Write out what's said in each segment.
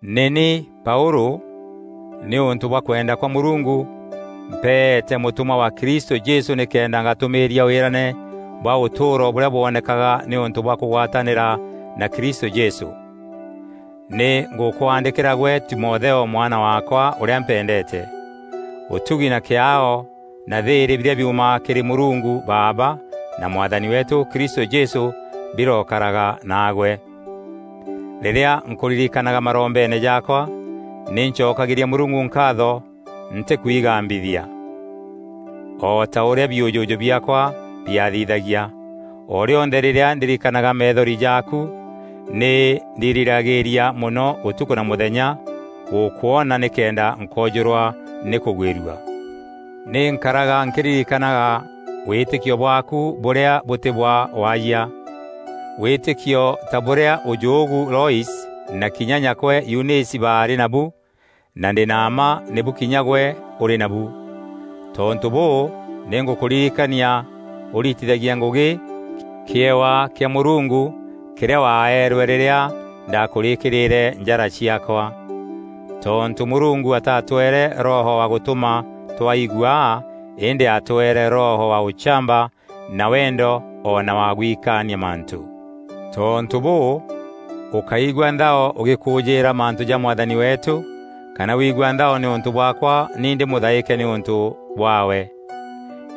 Nî ni Paûlû, nîûntû bwa kwenda kwa Mûrungu, mpeete mûtûmwa wa Kristû Jesû nîkenda ngatûmîîria wîrane bwa ûtûûro bûrîa bwonekaga nîûntû bwa kûgwatanîra na Kristû Jesû. Nî ngûkwaandîkîra gwe Timotheo mwana waakwa ûrîa mpendeete. Ûtugi na kîaao na thîîrî birîa biumaga kîrî Mûrungu Baaba na Mwathani weetû Kristû Jesû birokaraga naagwe. Rîrîa nkûririkanaga marombeene jaakwa nî ncokagîria Mûrungu nkaatho ntîkwigambithia, o ta ûrîa biûjûjû biaakwa biaathithagia. O rîonthe rîrîa ndirikanaga methori jaaku, nî ndiriragîîria mono ûtukû na mûthenya gûkwoona nîkenda nkoojûrwa nî kûgwîrua. Nî nkaraga nkîririkanaga wîtîkio bwaaku bûrîa bûtî bwa waayia. Wîtîkio ta bûrîa ûjûûgu Loise na kinya nyakwe Yunîsi baarî nabu na ndî na mma nîbu kinya gwe ûrî nabu. Tontû bûû, nî ngûkûririkania ûritithagie ngûgî kîewa kîa Mûrungu kîrîa waeerwe rîrîa ndakûrîkîrîre njara ciaakwa. Tontû Mûrungu atatweere Roho wa gûtûma twaa iguaa îndî atweere Roho wa ûchamba na wendo o na wa gwikaania mantû. Tontû bûû, ûkáigua nthao ûgîkûûjîîra mantû ja Mwathani weetû, kana wigua nthao nîûntû bwaakwa ni ndî mûthaîke nîûntû bwaawe.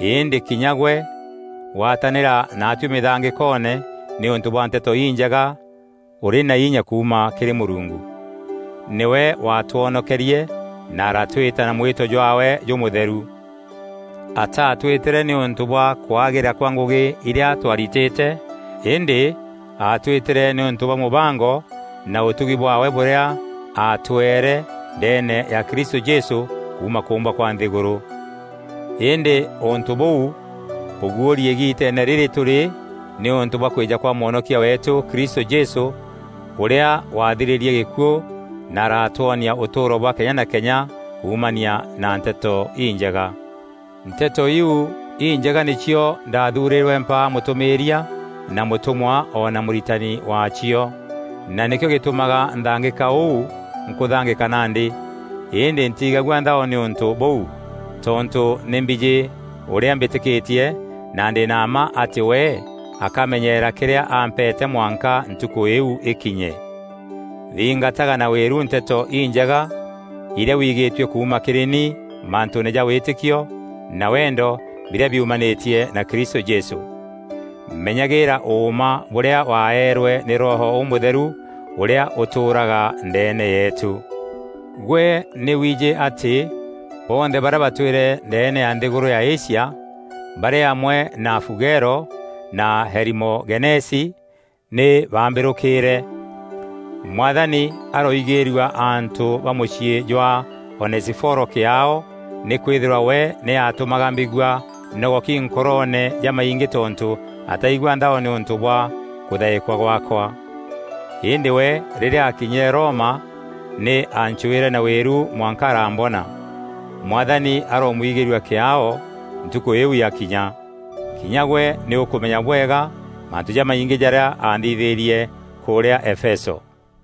Îndî kinya gwe gwatanîra naatuî mîthangîkoone nîûntû bwa Nteto Injega ûrî na inya kuuma kîrî Mûrungu. Nîwe waatwonokerie na aratwîta na mwîto jwaawe jûmûtheru. Ataatwîtîre nîûntû bwa kwagîra kwa ngûgî irîa twaaritîte, îndî aatwîtîre nîûntû bwa mûbango na ûtugi bwaawe bûrîa atweere ndeene ya Kristû Jesû kuuma kûûmbwa kwa nthîgûrû. Îndî ûntû bûu bûguûri îgiiteene rîrî tûrî nîûntû bwa kwîja kwa Mwonokia weetû Kristû Jesû, ûrîa wathirîrie gîkuû na aratwonia ûtûûro bwa kenya na kenya kuumania na Nteto Injega. Nteto iu Injega nîcio ndathuurîrwe mpaa mûtûmîîria na mûtûmwa o na mûritani waacio, na nîkîo gîtûmaga nthangîka ûu nkûthangîka nandî. Îndî ntiigagua nthao nî ûntû bûu, tontû nî mbijî ûrîa mbîtîkîtie, na ndî na mma atî we akamenyeera kîrîa ampeete mwanka Ntukû îu îkinye. Thingataga na wîru Nteto Injega irîa wigîîtue kuuma kîrî ni mantûûne ja wîtîkio na wendo birîa biumanîtie na Kristû Jesû. Menyagîîra ûûma bûrîa waeerwe nî Roho Ûmûtheru ûrîa ûtûûraga ndeene yeetû. Gwe nî wiijî atî bonthe barîa batwîre ndeene ya nthîgûrû ya Asia, barî amwe na Fugelo na Herimogenesi, nî baambîrûkîîre. Mwathani aroigîîrua antû ba mûciî jwa Onesiforo kîaao, nîkwîthîrwa we nî atûmaga mbigua nogoki nkoroone jamaingî tontû ataigua nthao nîûntû bwa kûthaîkwa gwaakwa. Îndî we rîrîa aakinyîre Roma nî aancwîre na wîru mwanka araambona. Mwathani aroomwigîîrua kîaao Ntukû îîu yakinya! Kinya gwe nî ûkûmenya bwega mantû jamaingî jarîa aanthithîîrie kûrîa Efeso.